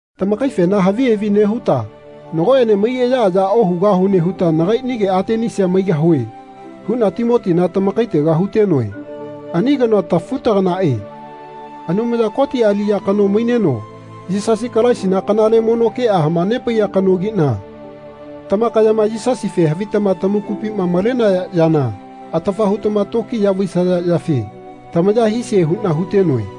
Tamakaifena havi havi nehuta nagoene maiyaaya ohugahune huta nagainige Atenisia maigahue huna Timotina tamakaitega hutenoe. Ani kanoa tafutaganae Anumaya Koti aliya kano maineno Yisasi Kalaisina kanale mono kea hamanepaiya kanogina tamakayama Yisasife havitama tamakupima malenaya yana atafa hutama tokiya vaisaya yafe tamaya hisie huna hutenoe.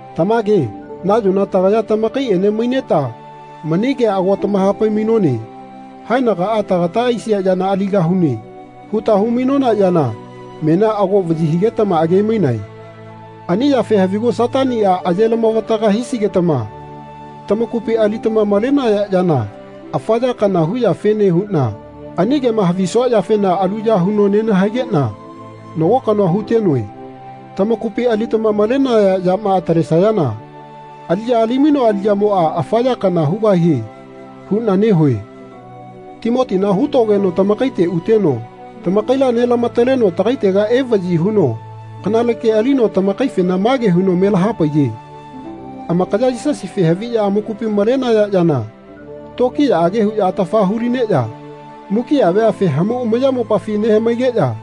Tamage nayona tagaya tamakaiene maineta mani kea ago tamahapai-mainone Haenagaa tagata aisia yana aligahune. huta hu-mainona yana menia ago vayi higetama age-mainae. Ani yafe havigu Satania aye-lamavataga hisigetama tamakupi alitama malenaya yana afa ya kana huyafene huna ani kema havisua yafena aluya huno nenahaigena nago kanoa hutenoe. Tamakupi alitama malenaya yama atalesayana aliya ali-mainoa aliyamoa afa ya kana hugahie huna nehue. Timotina hutogeno tamakaite uteno tamakaila nelama-taleno tagaitega evayi huno kanale ke alino tamakaifena mage huno melahapaiye Amakaya Yisasife haviya amakupi malenaya yana tokiyaage huya atafa hulineya mukia veafe hamau amayamopafi nehamaigeya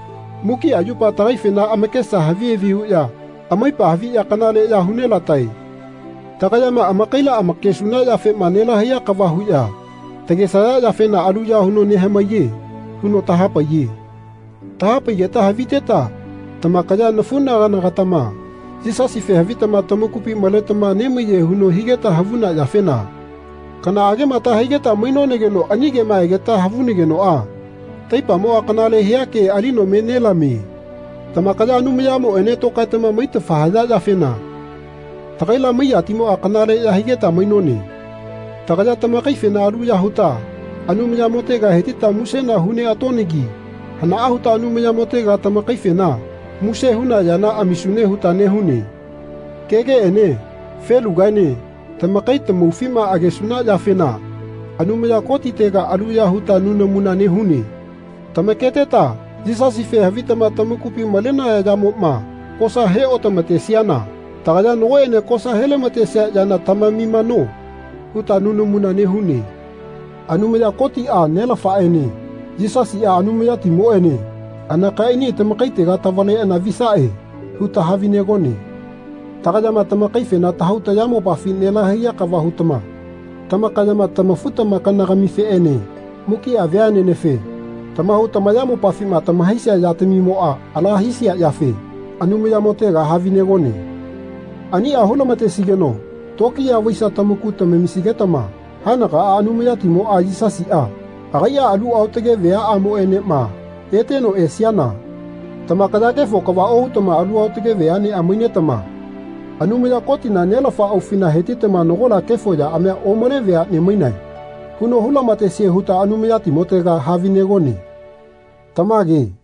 mukia yupa tagaifena amakesa havi havi huya amaipa haviya kanaleya hu nelatae. Tagayama amakaila amakesuna yafema nelahaiya kava huya tagesaya yafena aluya huno nehamaiye. huno tahapaiye. Tahapaigeta haviteta tamakaya nafunagana-gatama Yisasife havitama tamakupi maletama nemaiye huno higeta havuna yafena kanaagema tahaigeta mainonageno ani kema egeta havunagenoa taipamoa kanale hia ke alino me nelamie. Tamakaya Anumayamoene tokaetama maitafa haya yafena tagaila maiyatimoa kanaleya higeta mainone. Tagaya tamakaifena aluya huta Anumayamotega hetita musena hu neatonagi hanaa huta Anumayamotega tamakaifena muse huna yana amisune huta nehune. Kegeene felugaene tamakai tamaufima agesuna yafena Anumaya Kotitega aluya huta nunamuna nehune. Tamaketeta Yisasife havitama tamakupi malenaya yamoma kosa he otamatesiana tagaya Nagoene kosa helamatesia yana tamamimano. huta nunamuna nehune. Anumaya Kotia Nelafaene Yisasia Anumayatimoene anakaiani tamakaitega tavaleana visae huta havinegone. Tagayama tamakaifena tahau tayamopafi nelahaiya kava hutama tamakayama tamafu-tamakana-gamifeene mukia veanenefe tamahau tamayamopafima tamahaisia yatamimoa ala hisia yafe Anumayamotega havinegone. Ania hulamatesigeno tokiya vaisia tamaku tamamisigetama haenagaa Anumayatimoa Yisasia agaia alu aotage veaamoenema eteno esiana tamakaya kefo kava ohutama alu aotage veanea mainetama Anumaya Kotina, Nelafa aufina hetitama Nagola kefo yaamia omale veane mainae. huno hu-lamatesie huta Anumayatimotega havinegone. Tamage.